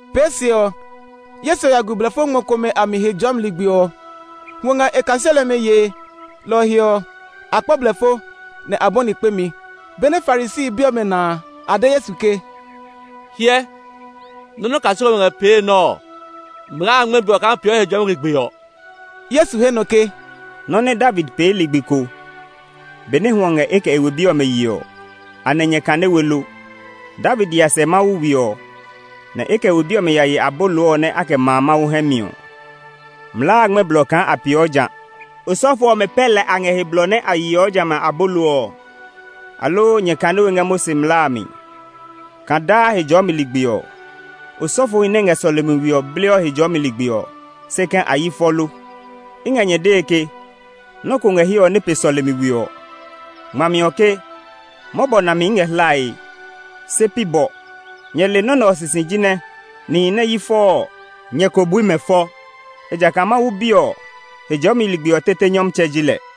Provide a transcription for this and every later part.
Pee se ɔ, Yesu ya gu blɛfo ngmɔ komɛ a mi Hejɔɔmi ligbi ɔ. Hwɔ ngɛ e kaseli ɔmɛ yee; lɔ ɔ he ɔ, a kpɔ blɛfo, nɛ a bɔni kpemi. Benɛ Farisi bi ɔmɛ na a, a de Yesu ke, “Hyɛ, nɔ́ nɛ o kaseli ɔmɛ ngɛ pee nɛ ɔ, mlaa a ngmɛ́ blɔ kaa a peeɔ Hejɔɔmi ligbi ɔ.” Yesu he nɔ ke, “Nɔ́ nɛ David pee ligbi ko, benɛ hwɔ ngɛ e kɛ e we bi ɔmɛ yee ɔ, anɛ nyɛ kane we lo? David ya sɛ Mawu we ɔ, nɛ e kɛ e we bi ɔmɛ ye abolo ɔ nɛ a kɛ maa Mawu hɛ mi ɔ. Mlaa a ngmɛ́ blɔ kaa a peeɔ ja; osɔfo ɔmɛ pɛ lɛ a ngɛ he blɔ nɛ a yeɔ jamɛ a abolo ɔ. Aloo nyɛ kane we ngɛ Mose mlaa a mi kaa daa Hejɔɔmi ligbi ɔ, osɔfohi nɛ ngɛ sɔlemi we ɔ bleɔ Hejɔɔmi ligbi ɔ, se kɛ̃ a yi fɔ lo? I ngɛ nyɛ dee ke, nɔ́ ko ngɛ hiɛ ɔ nɛ pe sɔlemi we ɔ. Ngmami ɔ ke, ‘Mɔbɔ nami i ngɛ hlae, se pi bɔ.’ Nyɛ le nɔ́ nɛ ɔ sisi jinɛ nihi nɛ yi fɔ ɔ, nyɛ ko bui mɛ fɔ. Ejakaa Mawu Bi ɔ, Hejɔɔmi ligbi ɔ tete nyɔmtsɛ ji lɛ.”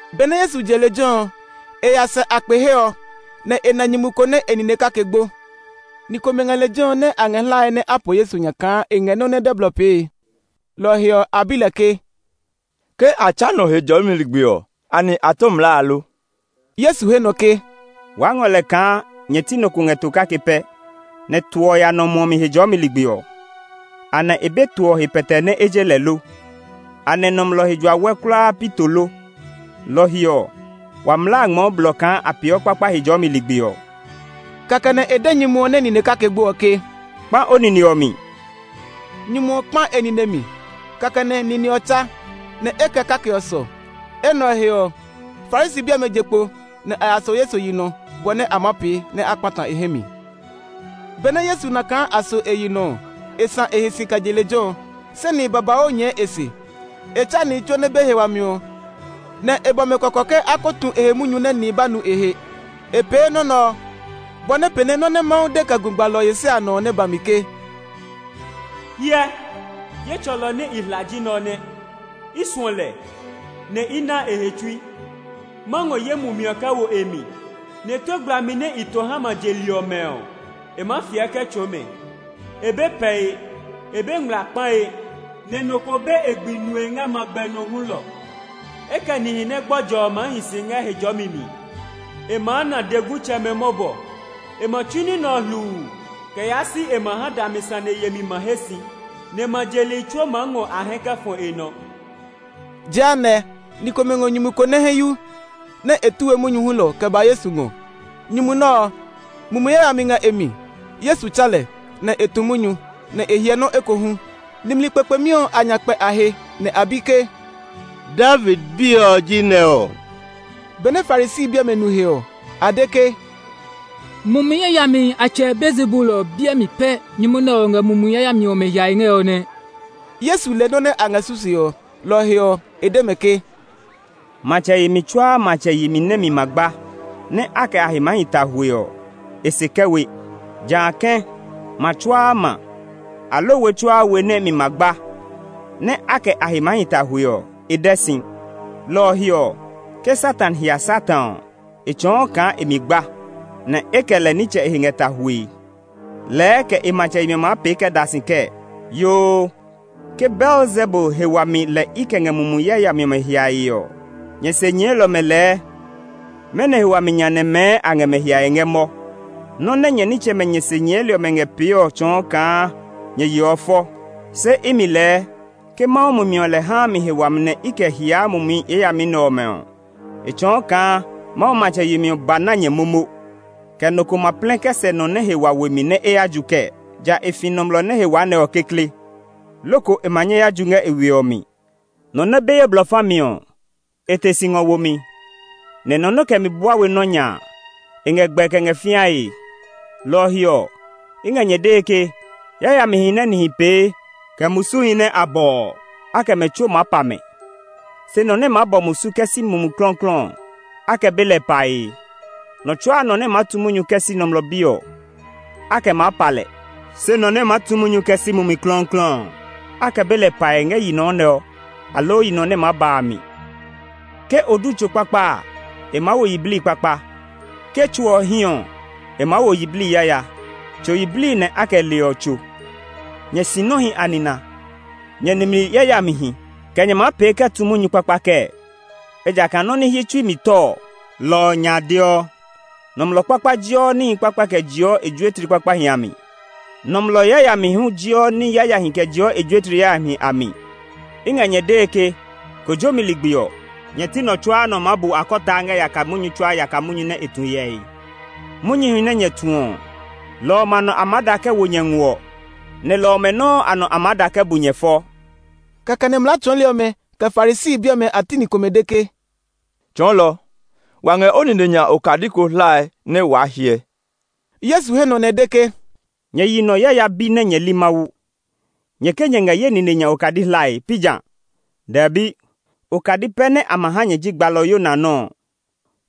Benɛ Yesu je lejɛ ɔ, e ya sɛ a kpe he ɔ, nɛ e na nyumu ko nɛ e nine kake gbo. Ni komɛ ngɛ lejɛ ɔ nɛ a ngɛ hlae nɛ a po Yesu nya kaa e ngɛ nɔ́ nɛ dɛ blɔ pee. Lɔ ɔ he ɔ, a bi lɛ ke, “Ke a tsa nɔ Hejɔɔmi ligbi ɔ, anɛ a tɔ mlaa a lo?” Yesu he nɔ ke, “Waa ngɔ lɛ kaa nyɛ ti nɔ ko ngɛ to kake pɛ, nɛ to ɔ ya nɔ muɔ mi Hejɔɔmi ligbi ɔ. Anɛ e be to ɔ he pɛtɛe nɛ e je lɛ lo? Anɛ nɔmlɔ he jua wɛ kulaa pi to lo? Lɔ ɔ he ɔ, wa mlaa a ngmɛɔ blɔ kaa a pee kpakpa Hejɔɔmi ligbi ɔ.” Kɛkɛ nɛ e de nyumu ɔ nɛ nine kake gbo ɔ ke, “Kpã o nine ɔ mi!” Nyumu ɔ kpã e nine ɔ mi. Kɛkɛ nɛ nine ɔ tsa, nɛ e kɛ kake ɔ sɔ. Enɛ ɔ he ɔ, Farisi bi ɔmɛ je kpo, nɛ a ya so Yesu yi nɔ, bɔ nɛ a maa pee nɛ a kpata e hɛ mi. Benɛ Yesu nu kaa a so e yi nɔ ɔ, e sã e he si kɛ je lejɛ ɔ, se nihi babauu nyɛɛ e se. E tsa nihi tsuo nɛ be he wami ɔ, nɛ e bɔ mɛ kɔkɔ ke a ko tu e he munyu nɛ nihi ba nu e he. E pee nɔ́ nɛ ɔ, bɔ nɛ pee nɛ nɔ́ nɛ Mawu de kɛ gu gbalɔ Yesaya nɔ ɔ nɛ ba mi ke, “Hyɛ, ye tsɔlɔ nɛ i hla a ji nɛ ɔ nɛ; i suɔ lɛ, nɛ i naa e he tsui. Ma ngɔ ye mumi ɔ kɛ wo e mi, nɛ tue gblami nɛ i to ha ma je li ɔmɛ ɔ, e maa fiɛ kɛ tsɔɔ mɛ. E be pɛe; e be ngmlaa kpae, nɛ nɔ ko be e gbi nue ngɛ magbɛ nɔ hulɔ. E kɛ nihi nɛ gbɔjɔ ɔ maa hi si ngɛ he jɔmi mi. E maa na dɛgutsɛmɛ mɔbɔ. E ma tsu ní nɛ ɔ hluu kɛ yaa si e ma ha nɛ dami sane yemi ma he si. Nɛ ma je li tsuo maa ngɔ a hɛ kɛ fɔ e nɔ.” Jehanɛ, ni komɛ ngɔ nyumu ko nɛ hɛ yu, nɛ e tu we munyu hulɔ kɛ ba Yesu ngɔ; nyumu nɛ ɔ, mumi yayami ngɛ e mi. Yesu tsa lɛ, nɛ e tu munyu, nɛ e hyɛ nɔ́ ekohu. Nimli kpekpemi ɔ a nya kpɛ a he, nɛ a bi ke, “David Bi ɔ ji nɛ ɔ?” Benɛ Farisi bi ɔmɛ nu he ɔ, a de ke, “Mumi yayamihi a tsɛ Beelzebul ɔ biɛ mi pɛ nyumu nɛ ɔ ngɛ mumi yayami ɔmɛ hiae ngɛ ɔ nɛ.” Yesu le nɔ́ nɛ a ngɛ susue ɔ, lɔ ɔ he ɔ, e de mɛ ke, “Matsɛ yemi tsuaa matsɛ yemi nɛ mi ma gba, nɛ a kɛ a he maa hi ta hwue ɔ, e se kɛ we. Jã kɛ̃, ma tsuaa ma, aloo we tsuaa we nɛ e mi ma gba, nɛ a kɛ a he maa hi ta hwue ɔ, e dɛ si. Lɔ ɔ he ɔ, ke Satan hia Satan ɔ, e tsɔɔ kaa e mi gba, nɛ e kɛ lɛ nitsɛ e he ngɛ ta hwue. Lɛɛ kɛ e matsɛ yemi ɔ maa pee kɛ da si kɛɛ! Yoo, ke Beelzebul he wami lɛ i kɛ ngɛ mumi yayami ɔmɛ hiae ɔ, nyɛ se nyɛɛli ɔmɛ lɛɛ mɛnɔ he wami nya nɛ mɛɛ a ngɛ mɛ hiae ngɛ mɔ? Nɔ́ nɛ nyɛ nitsɛmɛ nyɛ se nyɛɛli ɔmɛ ngɛ pee ɔ tsɔɔ kaa nyɛ yeɔ fɔ! Se imi lɛɛ ke Mawu Mumi ɔ lɛ haa mi he wami nɛ i kɛ hiaa mumi yayami ɔmɛ ɔ, e tsɔɔ kaa Mawu matsɛ yemi ɔ ba na nyɛ momo. “Kɛ nɔ ko ma plɛ kɛ sɛ nɔ nɛ he wa we mi nɛ e ya ju kɛɛ? Ja e fi nɔmlɔ nɛ he wa nɛ ɔ kekle, loko e ma nyɛ ya ju ngɛ e we ɔ mi. “Nɔ nɛ be ye blɔ fa mi ɔ, e te si ngɔ wo mi, ne nɔ nɛ kɛ mi bua we nɔ́ nya a, e ngɛ gbɛe kɛ ngɛ fĩae. Lɔ ɔ he ɔ, i ngɛ nyɛ dee ke, yayamihi nɛ nihi pee, kɛ musuhi nɛ a bɔ ɔ, a kɛ lɛ tsuo maa pa mɛ. Se nɔ nɛ maa bɔ musu kɛ si Mumi Klɔuklɔu ɔ, a kɛ be lɛ pae. Nɔ tsuaa nɔ nɛ maa tu munyu kɛ si Nɔmlɔ Bi ɔ, a kɛ maa pa lɛ. Se nɔ nɛ maa tu munyu kɛ si Mumi Klɔuklɔu ɔ, a kɛ be lɛ pae ngɛ yi nɔ nɛ ɔ, aloo yi nɔ nɛ maa ba a mi. “Ke o du tso kpakpa a, e maa wo yiblii kpakpa; ke tso ɔ hí ɔ, e maa wo yiblii yaya. Tso yiblii nɛ a kɛ leɔ tso. Nyɛ sinɔhi a nina! Nyɛ nimli yayamihi! Kɛ nyɛ maa pee kɛ tu munyu kpakpa kɛɛ? Ejakaa nɔ́ nɛ hyi tsui mi tɔ ɔ, lɔ ɔ nya deɔ. Nɔmlɔ kpakpa jeɔ ní kpakpahi kɛ jeɔ e juetli kpakpahi a mi; nɔmlɔ yayami hu jeɔ ní yayahi kɛ jeɔ e juetli yayahi a mi. “I ngɛ nyɛ dee ke kojomi ligbi ɔ, nyɛ ti nɔ tsuaa nɔ maa bu akɔtaa ngɛ yaka munyu tsuaa yaka munyu nɛ e tu hyɛ he. Munyuhi nɛ nyɛ tu ɔ, lɔ ɔmɛ a nɔ a maa da kɛ wo nyɛ nguɔ, nɛ lɔ ɔmɛ nɔuu a nɔ a maa da kɛ bu nyɛ fɔ.” Kɛkɛ nɛ mlaa tsɔɔli ɔmɛ, kɛ Farisi bi ɔmɛ a ti ni komɛ de ke, “Tsɔɔlɔ, wa ngɛ o nine nya okadi ko hlae nɛ waa hyɛ.” Yesu he nɔ nɛ e de ke, “Nyɛ yi nɔ yaya bi nɛ nyɛ li Mawu! Nyɛ ke nyɛ ngɛ ye nine nya okadi hlae, pi ja? Dɛbi! Okadi pɛ nɛ a ma ha nyɛ ji gbalɔ Yona nɔ́ ɔ.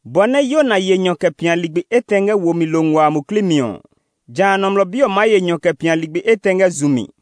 Bɔ nɛ Yona ye nyɔ kɛ pia ligbi etɛ ngɛ wo mi lo nguaa a muklii mi ɔ, jã Nɔmlɔ Bi ɔ maa ye nyɔ kɛ pia ligbi etɛ ngɛ zu mi.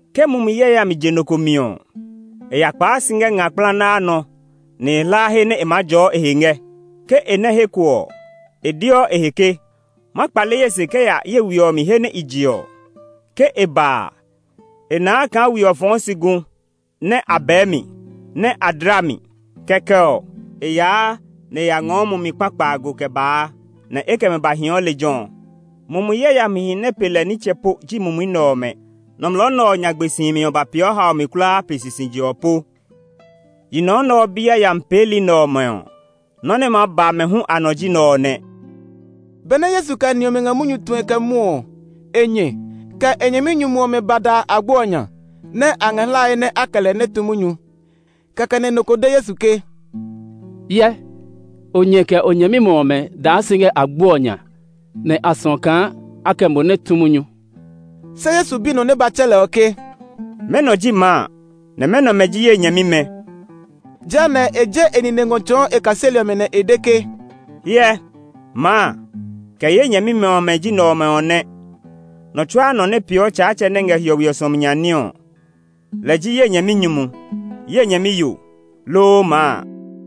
“Ke mumi yayami je nɔ ko mi ɔ, e ya kpaa si ngɛ nga kplanaa nɔ nɛ e hlaa he nɛ e maa jɔɔ e he ngɛ. Ke e nɛ́ he ko ɔ, e deɔ e he ke, ‘Ma kpale ye se kɛ ya ye we ɔ mi he nɛ i je ɔ.’ Ke e ba a, e naa kaa we ɔ fɔɔ si gu, nɛ a bɛɛ mi, nɛ a dla mi. Kɛkɛ ɔ, e yaa nɛ e ya ngɔɔ mumi kpa kpaago kɛ baa, nɛ e kɛ mɛ ba hii lejɛ ɔ. Mumi yayamihi nɛ pe lɛ nitsɛ po ji mumi nɛ ɔmɛ. Nɔmlɔ nɛ ɔ nyagbe si himi ɔ ba peeɔ haomi kulaa pe sisije ɔ po. Yi nɔ nɛ ɔ bi yayami peeli nɛ ɔmɛ ɔ, nɔ́ nɛ maa ba mɛ hu a nɔ ji nɛ ɔ nɛ.” Benɛ Yesu kɛ ni ɔmɛ ngɛ munyu tue kɛ mwɔɔ ɔ, e nyɛ, kɛ e nyɛminyumu ɔmɛ ba da agbo ɔ nya, nɛ a ngɛ hlae nɛ a kɛ lɛ nɛ tu munyu. [ Kɛkɛ nɛ nɔ ko de Yesu ke, “Hyɛ, o nyɛ, kɛ o nyɛmimɛ ɔmɛ daa si ngɛ agbo ɔ nya, nɛ a suɔ kaa a kɛ mo nɛ tu munyu.”] Se Yesu bi nɔ nɛ ba tsɛ lɛ ɔ ke, “Mɛnɔ ji maa, nɛ mɛnɔmɛ ji ye nyɛmimɛ?” Jehanɛ, e je e nine ngɔ tsɔɔ e kaseli ɔmɛ, nɛ e de ke, “Hyɛ, maa, kɛ ye nyɛmimɛ ɔmɛ ji nɛ ɔmɛ ɔ nɛ. Nɔ tsuaa nɔ nɛ peeɔ Tsaatsɛ nɛ ngɛ hiɔwe ɔ suɔmi nya ní ɔ, lɛ ji ye nyɛminyumu, ye nyɛmiyo, loo maa.”